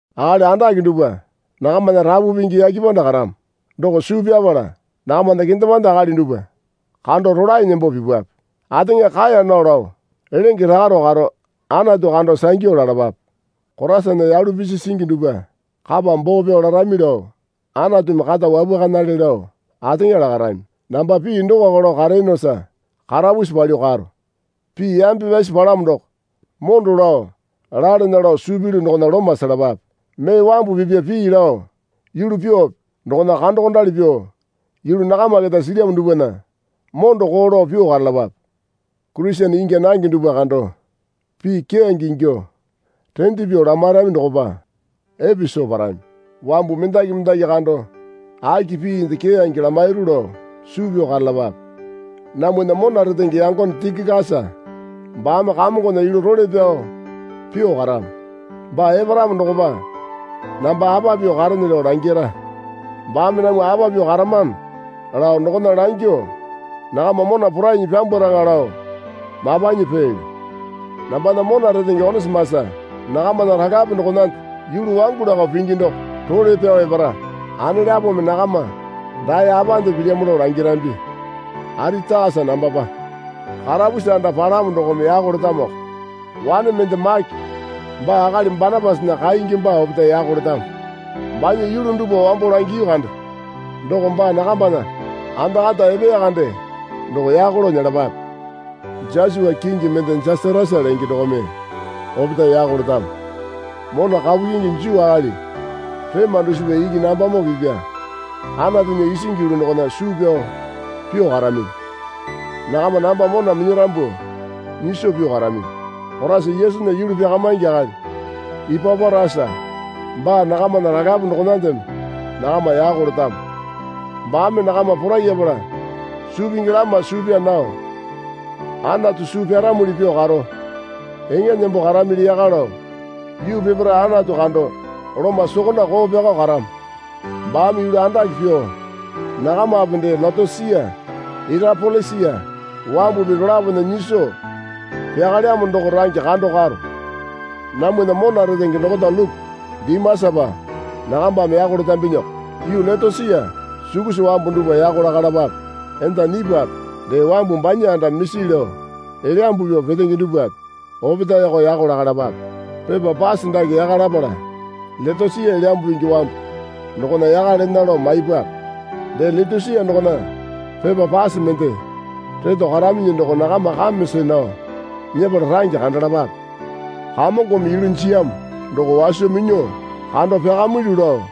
Akali andake dupwa nakamana Rapu Pingi yake panda karamo doko suu pyapala nakamana kendemande akali dupwa kando rolae nembo pipwape. Ateŋa kaeya nao lao lenge rakaro karo Anatu kando sangyu lalapape. Koraisana yalu pisi singi dupwa kapa boo pyao larami lao Anatumi kata wapwakanale lao ateŋa lakarami. Namba pii dokoko lao kareyonosa karapusi palyuo karo. Pii yambe pyasi palamo doko mondo lao lalana lao suu pilyu dokona loma selapape. Mee wambu pipa pii lao yulu pyuope dokona kandokondali pyuo yulu nakama keta silyamo dupwana mondo koo lao pyuo karalapape. Kurisene ingya nange dupwa kando pii keyange ingyuo rende pyuo lamairami dokopa epe soo parami. Wambu mendaki mendaki kando aki piinde keyange lamairu lao suu pyao karalapape. Namwana mona retenge yangone Tikikasa baame Kamongona yulu role pyao pyuo karamo. Baa eparamo dokopa namba apa pyuo karene lao langira. Baame namwa apa pyuo karamano lao dokona langyuo nakama mona porainyi pyambwaraŋa lao mapanyi peelyo. Nambana mona retenge Onisimasa nakamana ralape dokonande yulu wangu lakao pingi doko role pyao epara. Anelapome nakama dae apande pilyamo lao langirambi. Aritakasa nambapa karapusi anda palamo dokome yako letamoko. Wane mende Make baa akali Banapasana kingi baa opetae yako letamo. Banya yulu dupwa wambo langiyu kande doko baa nakambana anda kata epeya kande doko yako lao nyelapape. Josua kingi mende Jasatasa lenge dokome opetae yako letamo. Mona kapu kyingi Juu akali rema dusipa iki nambamoo pipya Anatunya isingi yulu dokona suu pyao pyuo karaminyi. Nakama namba mona minyarambu nyiso pyuo karaminyi. Koraisa Yesunya yulu pyakamaingi akali Ipaporasa baa nakamana ralape dokonandeme nakama yako letamo. Baame nakama porayapala suu pingi lama suu pyaa nao Anatu suu pyaramuli pyuo karo eŋa nembo karamili yaka lao yuu peparae Anatu kando loma sokonda koo pyako karamo. Baame yulu andake pyuo nakamape dee Leotosia Irapolisa wambupi dolapona nyiso pyakalyamo doko range kando karo. Namwana mona retenge dokota Luku Dimasapa nakambame yako letambinyiko. Yuu Leotosia sukusa wambu dupwa yako lakalapape. Enda Nipape dee wambu banya anda misi lao elyambu pyuo petenge dupwape opetaeko yako lakalapape. Pepa pase dake yaka lapala Leotosia Elyambu Pingi wambu dokona yaka lena lao maipwape. Dee Leotosia dokona pepa pase mende reto karaminyi doko nakama kame see nao nyepala range kandalapape. Kamongome yulu jiyamo doko waso minyuo kando pyakamilyu lao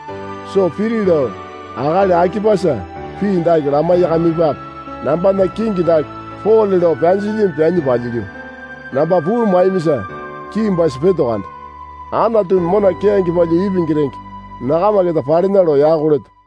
soo piri lao akali Akipasa pii dake lamaiyakamipape. Nambana kingi dake Pole lao pyanjilyimi pyanyi palyilyu. Namba puu maiyamisa kiimbasi peto kande. Anatumi mona keyange palyuo ipingi renge nakama keta palena lao yako leto.